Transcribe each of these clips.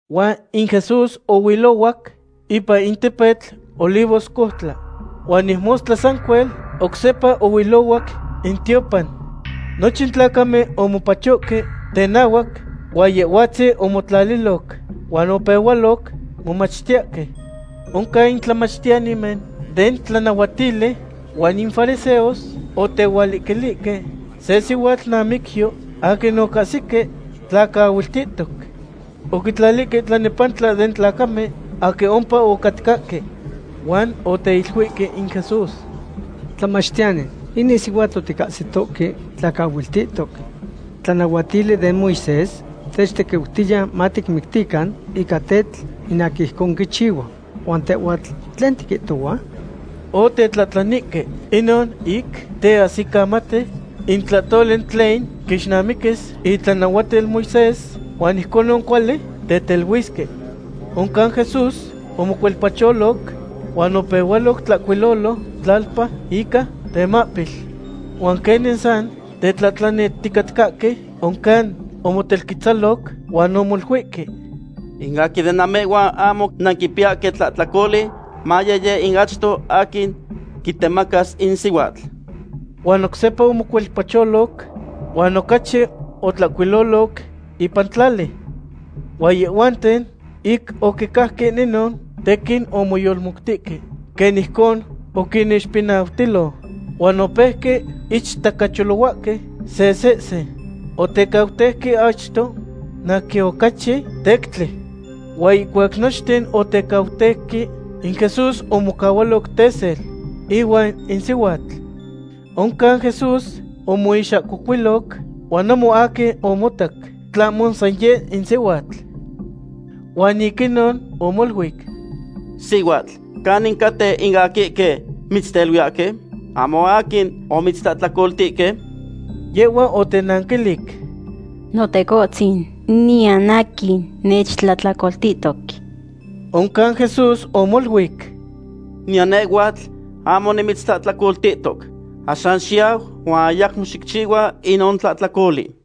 Huan in Jesús ohuilohuac ipan in tepetl Olivoscoutla. Huan ic mostla sancuel, oc sepa ohuilohuac in tiopan. Nochin tlacamen omopachohque tenahuac, huan Yehhuatzin omotlaliloc huan opehualoc momachtiyahque. Oncan in tlamachtiyanimen den tlanahuatili huan in fariseos otehualiquilihque se sihuatl namicyo aquin ocahsique tlacaahuiltihtoc. Oquitlalihque tlanepantla den tlacamen aquin ompa ocatcahque. Huan oteiluihque in Jesús: ―Tlamachtiyani, inin sihuatl oticahsitohque tlacaahuiltihtoc. In tlanahuatili den Moisés techtequiutiya maticmictican ica tetl in aquin ijcon quichihua. ¿Huan tehhuatl, tlen tiquihtohua? Otetlahtlanihque inon ic teahsicamati in tlahtoli tlen quixnamiquis itlanahuatil Moisés, huan ijconon cuali teteluisque. Oncan Jesús omocuelpacholoc huan opehualoc tlahcuilolo tlalpa ica temahpil. Huan quenin san tetlahtlanihticatcahque, oncan omotelquetzaloc huan omoluihque: ―In aquin den namehhuan ahmo nanquipiyahque tlahtlacoli, maye yeh in achto aquin quitemacas in sihuatl. Huan oc sepa omocuelpacholoc huan ocachi otlahcuiloloc ipan tlali. Huan yehhuanten, ic oquicajque inon, tequin omoyolmoutihque quen ijcon oquinixpinautilo, huan opeuque ichtacacholohuahque se sehse. Otecauteuque achto in aquin ocachi tectli. Huan ihcuac nochten otecauteuque, in Jesús omocahualoc tesel ihuan in sihuatl. Oncan Jesús omoixahcocuiloc, huan ahmo aquin omotac tlahmo san yeh in sihuatl. Huan ic inon omoluic: ―Sihuatl, ¿canin caten in aquihque mitzteluiyahque? ¿Ahmo aquin omitztlahtlacoltihque? Yehhua otenanquilic: ―Notecohtzin, niyan aquin nechtlahtlacoltihtoc. Oncan Jesús omoluic: ―Niyan nehhuatl ahmo nimitztlahtlacoltihtoc. Axan xiyau huan ayacmo xicchihua inon tlahtlacoli.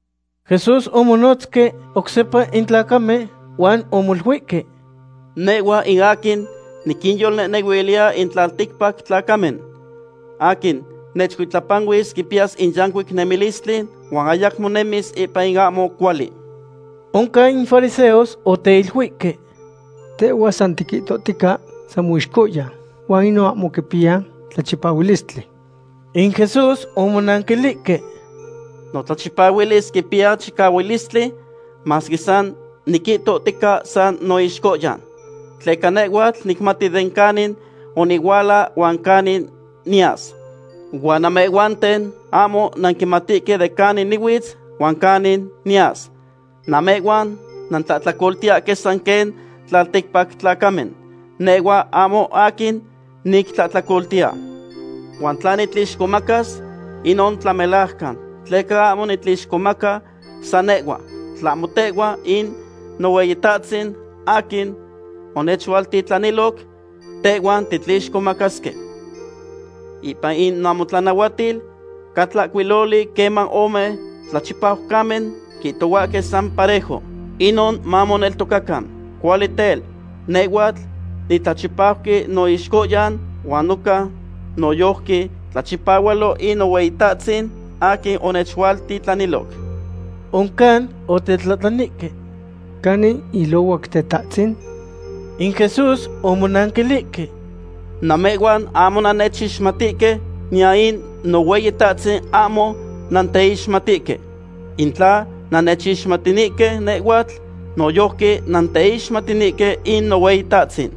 Jesús omonotzque oc sepa in tlacamen, huan omoluihque: ―Nehhua in aquin niquinyolnehnehuiltiya in tlalticpac tlacamen. Aquin nechcuitlapanuis quipiyas in yancuic nemilistli huan ayacmo nemis ipan in ahmo cuali. Oncan in fariseos oteiluihque: ―Tehhua san tiquihtohtica san moixcohyan, huan inon ahmo quipiya tlachipahualistli. In Jesús omonanquilihque: ―Notlachipahualis quipiya chicahualistli masque san niquihtohtica san noixcohyan. Tleca nehhuatl nicmati den canin onihuala huan canin niyas, huan namehhuanten ahmo nanquimatihque den canin nihuitz huan canin niyas. Namehhuan nantlahtlacoltiyahque san quen tlalticpac tlacamen. Nehhua ahmo aquin nictlahtlacoltiya. Huan tla nitlixcomacas, inon tlamelajcan, tleca ahmo nitlixcomaca san nehhua, tlahmo tehuan in Nohueyitahtzin aquin onechualtitlaniloc, tehhuan titlixcomacasque. Ipan in namotlanahuatil ca tlahcuiloli queman ome tlachipaucamen quihtohuahque san parejo, inon mamoneltocacan. Cuali tel, nehhuatl nitlachipauqui noixcohyan huan noca noyojqui tlachipahualo in Nohueyitahtzin aquin onechualtitlaniloc. Oncan otetlahtlanihque: ―¿Canin ilohuac Tetahtzin? In Jesús omonanquilihque: ―Namehhuan ahmo nannechixmatihque, niyan in Nohueyitahtzin ahmo nanteixmatihque. In tla nannechixmatinihque nehhuatl, noyojqui nanteixmatinihque in Nohueyitahtzin.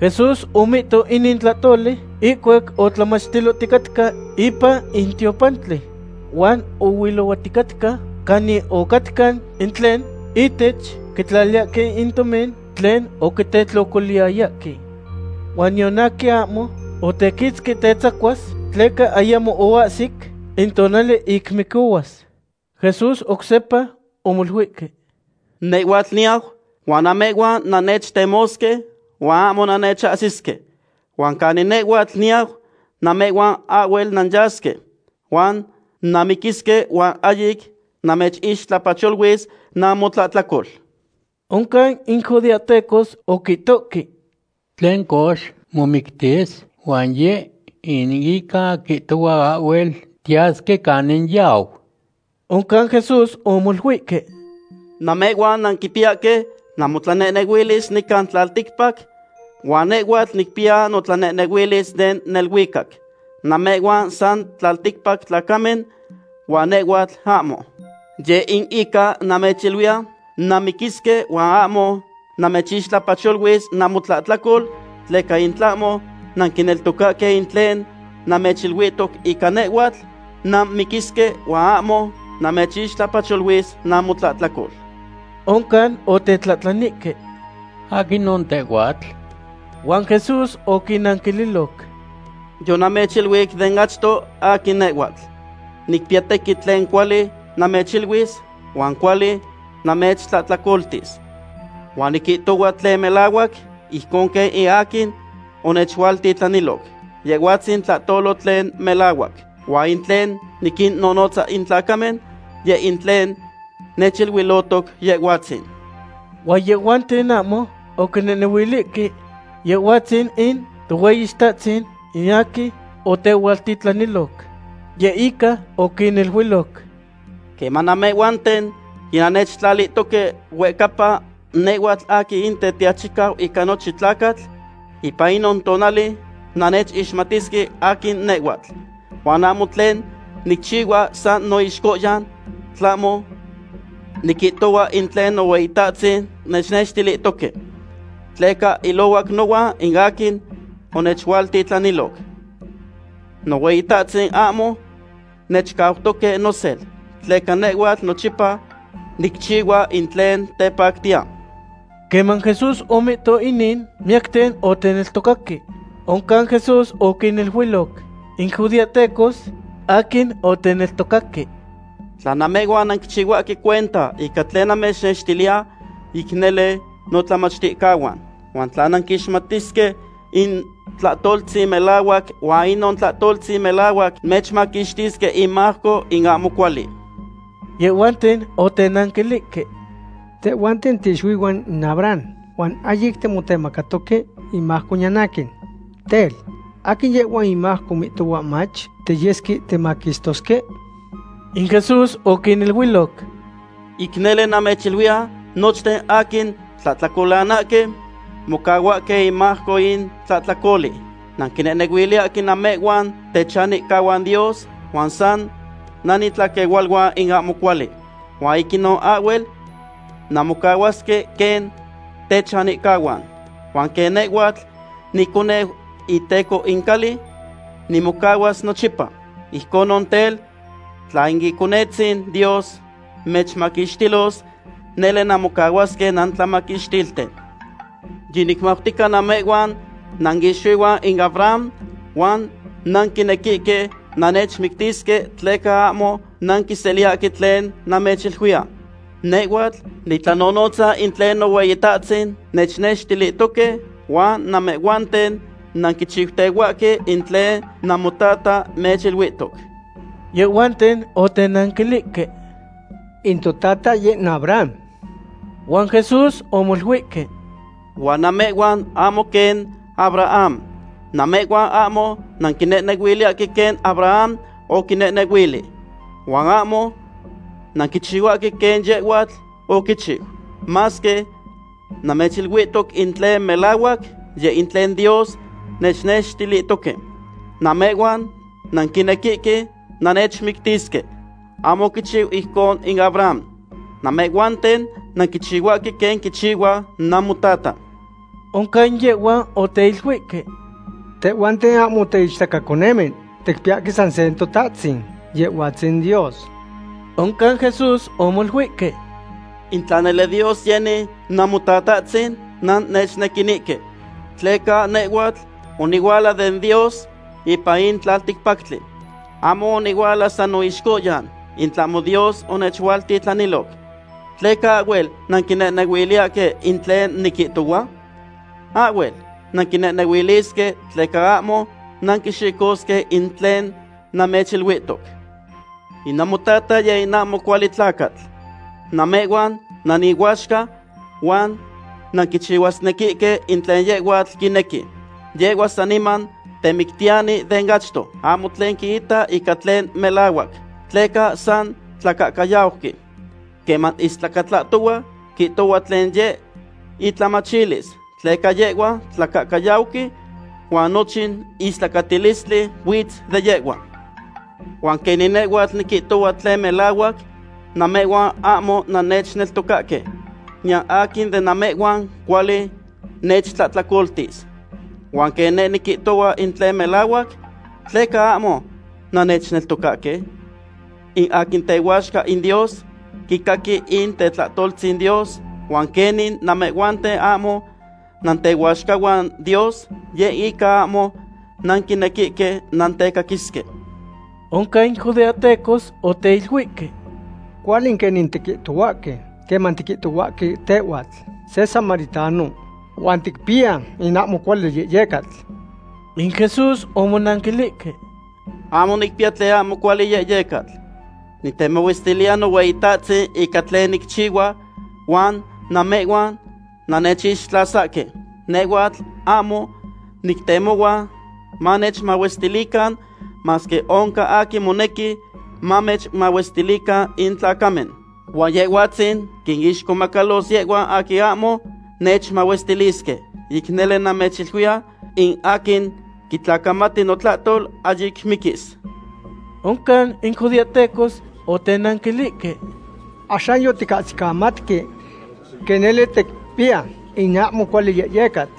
Jesús omihto inin tlahtoli ihcuac otlamachtiloticatca ipan in tiopantli. Huan oihcatiloticatca canin ocatca in tlen ihtech quitlaliyahque in tomin tlen oquitetlocoliyahque. Huan niyan aquin ahmo otequitzqui tetzacuas, tleca ayamo oahsic in tonali ic micohuas. Jesús oc sepa omoluihque: ―Nehhuatl niyau, huan namehhuan nannechtemosque, huan ahmo nannechahsisque. Huan canin nehhuatl niyau, namehhuan ahhuel nanyasque. Huan nanmiquisque huan ahyic namechixtlapacholuis namotlahtlacol. Oncan in judeahtecos oquihtoque: ―Tlen cox, ¿momictis, huan yeh in ica quihtohua ahhuel tiyasque canin yau? Oncan Jesús omoluihque: ―Namehhuan nanquipiyahque namotlanehnehuilis nican tlalticpac, huan nehhuatl nicpiya notlanehnehuilis den neluicac. Namehhuan san tlalticpac tlacamen huan nehhuatl ahmo. Yeh in ica namechiluiya nanmiquisque huan ahmo namechixtlapacholuis namotlahtlacol, tleca in tlahmo nanquineltocahque in tlen namechiluihtoc ica nehhuatl, nanmiquisque, huan ahmo namechixtlapacholuis namotlahtlacol. Oncan otetlahtlanihque: ―¿Aquinon tehhuatl? Huan Jesús oquinnanquililoc: ―Yonamechiluic den achto aquin nehhuatl. Nicpiya tequin tlen cuali namechiluis, huan cuali namechtlahtlacoltis. Huan niquihtohua tlen melahuac, ijcon quen in aquin onechualtitlaniloc. Yehhuatzin tlahtolo tlen melahuac. Huan in tlen niquinnonotza in tlacamen, yeh in tlen nechiluilotoc Yehhuatzin. Huan yehhuanten ahmo oquinehnehuilihque Yehhuatzin in Tohueyitahtzin in aquin otehualtitlaniloc. Yeh in ica oquiniluiloc: ―Queman namehhuanten yinannechtlalihtoque huehcapa nehhuatl aquin in Tetiachicau ica nochin tlacatl, ipan inon tonali nannechixmatisque aquin nehhuatl. Huan ahmo tlen nicchihua san noixcohyan; tlahmo niquihtohua in tlen Nohueyitahtzin nechnextilihtoque. Tleca ilohuac nohuan in aquin onechualtitlaniloc. Nohueyitahtzin ahmo nechcautoque nosel, tleca nehhuatl nochipa nicchihua in tlen tepactiya. Queman Jesús omihto inin, miyacten oteneltocaque. Oncan Jesús oquiniluiloc in judeahtecos aquin oteneltocaque: ―Tla namehhuan nanquichihuahque cuenta ica tlen namechnextiliya, ic nele notlamachticahuan. Huan nanquixmatisque in tlahtoltzin melahuac huan inon tlahtoltzin melahuac mechmaquixtisque imajco in ahmo cuali. Yehhuanten otenanquilihque: ―Tehhuanten tiixuihuan in Abraham, huan ahyic timotemacatoque imajco niyan aquin. Tel, ¿aquin yehhua imajco mihtohua mach tiyesque timaquistosque? In Jesús oquiniluiloc: ―Ic nele namechiluiya, nochten aquin tlahtlacolanahque mocahuahque imajco in tlahtlacoli. Nanquinehnehuiliyahque namehhuan techanihcahuan Dios, huan san nanitlaquehualuan in ahmo cuali. Huan ic inon ahhuel nanmocahuasque quen techanihcahuan. Huan quen nehhuatl niconeu iteco in cali, nimocahuas nochipa. Ijconon tel, tla in Iconetzin Dios mechmaquixtilos, nele nanmocahuasque nantlamaquixtilten. Yinicmautica namehhuanten nanixuihuan in Abraham, huan nanquinequihque nannechmictisque, tleca ahmo nanquiseliyahque tlen namechiluiya. Nehhuatl nitlanonotza in tlen Nohueyitahtzin nechnextilihtoque, huan namehhuanten nanquichiutehuahque in tlen namotata mechiluihtoc. Yehhuanten otenanquilihque: ―In totata yeh in Abraham. Huan Jesús omoluihque: ―Huan namehhuan ahmo quen Abraham. Namehhuan ahmo nanquinehnehuiliyahque quen Abraham oquinehnehuili. Huan ahmo nanquichihuahque quen yehhuatl oquichiu. Masque namechiluihtoc in tlen melahuac, yeh in tlen Dios nechnextilihtoque, namehhuan nanquinequihque nannechmictisque. ¡Ahmo oquichiu ijcon in Abraham! Namehhuanten nanquichihuahque quen quichihua namotata. Oncan yehhuan oteiluihque: ―Tehhuanten ahmo tiichtacaconemen, ticpiyahque san se Totatahtzin, Yehhuatzin Dios. Oncan Jesús omoluihque: ―In tla nele Dios yeni Namotatahtzin, nannechnequinihque, tleca nehhuatl onihuala den Dios ipan in tlalticpactli. Ahmo onihuala san noixcohyan, in tlahmo Dios onechualtitlaniloc. ¿Tleca ahhuel nanquinehnehuiliyahque in tlen niquihtohua? Ahhuel nanquinehnehuilisque tleca ahmo nanquixicosque in tlen namechiluihtoc. In namotata yeh in ahmo cuali tlacatl. Namehhuan nanihuaxca, huan nanquichihuasnequihque tlen yehhuatl quinequi. Yehhua saniman temictiyani den achto. Ahmo tlen quita ica tlen melahuac, tleca san tlacahcayauqui. Queman istlacatlahtohua, quihtohua tlen yeh itlamachilis, tleca yehhua tlacahcayauqui, huan nochin istlacatilistli huitz de yehhua. Huan quenin nehhuatl niquihtohua tlen melahuac, namehhuan ahmo nannechneltocahque. Niyan aquin de namehhuan cuali nechtlahtlacoltis. Huan quen neh niquihtohua in tlen melahuac, ¿tleca ahmo nannechneltocahque? In aquin tehuaxca in Dios, quicaqui in tetlahtoltzin Dios, huan quenin namehhuanten ahmo nantehuaxcahuan Dios, yeh in ica ahmo nanquinequihque nantecaquisque. Oncan in judeahtecos oteiluihque: ―Cuali quenin tiquihtohuahque queman tiquihtohuahque tehhuatl se samaritano huan ticpiya in ahmo cuali yehyecatl. In Jesús omonanquilihque: ―Ahmo nicpiya tlen ahmo cuali yehyecatl. Nitemahuestiliya Nohueyitahtzin ica tlen nicchihua, huan namehhuan nannechixtlasahque. Nehhuatl ahmo nictemohua manechmahuestilican, masque oncan aquin monequi manechmahuestilican in tlacamen. Huan Yehhuatzin quinixcomacalos yehhuan aquin ahmo nechmahuestilisque. Ic nele namechiluiya, in aquin quitlacamati notlahtol ahyic miquis. Oncan in judeahtecos otenanquilihque: ―Axan yoticahsicamatque quen nele ticpiya in ahmo cuali yehyecatl.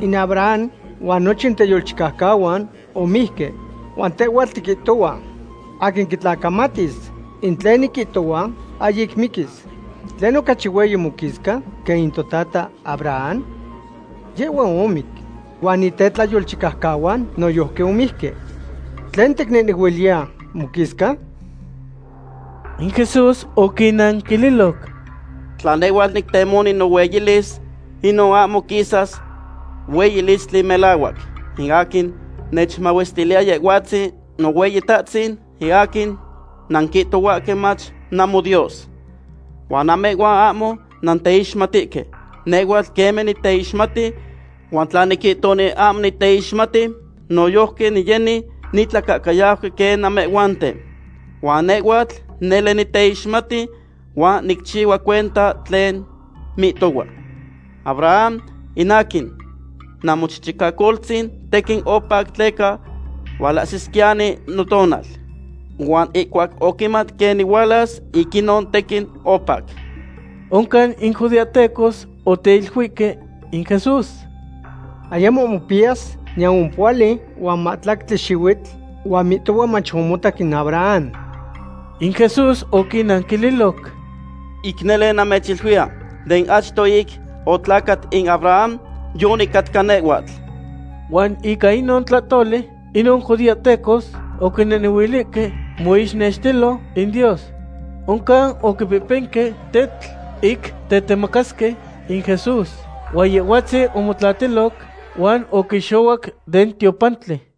In Abraham huan nochin tetlayolchicaucahuan omijque, huan tehhuatl tiquihtohua: “Aquin quitlacamatis in tlen niquihtohua, ahyic miquis.” ¿Tlen, ocachi hueyi moquisca quen in totata Abraham? Yehhua omic huan in tetlayolchicaucahuan noyojqui omijque. ¿Tlen ticnehnehuiliya moquisca? In Jesús oquinnanquililoc: ―Tla nehhuatl nictemoni nohueyilis, inon ahmo quisas hueyilistli melahuac. In aquin nechmahuestiliya Yehhuatzin Nohueyitahtzin, in aquin nanquihtohuahque mach namoDios. Huan namehhuan ahmo nanteixmatihque. Nehhuatl queme niteixmati, huan tla niquihtoni ahmo niteixmati, noyojqui niyeni nitlacahcayauqui quen namehhuanten. Huan nehhuatl nele niteixmati, huan nicchihua cuenta tlen mihtohua. Abraham, in aquin namochichicacoltzin, tequin opac tleca hualahsisquiyani notonal. Huan ihcuac oquimat quen nihualas, ic inon tequin opac. Oncan in judeahtecos oteiluihque in Jesús: ―Ayamo mopiyas niyan ompohuali huan mahtlactli xihuitl. Huan mihtohua mach omotac in Abraham. In Jesús oquinnanquililoc: ―Ic nele namechiluiya, den achto ic otlacat in Abraham, yonicatca nehhuatl. Huan ica inon tlahtoli inon judeahtecos oquinehnehuilihque moixnextilo in Dios. Oncan oquipehpenque tetl ic tetemacasque in Jesús; huan Yehhuatzin omotlatiloc huan oquixohuac den tiopantli.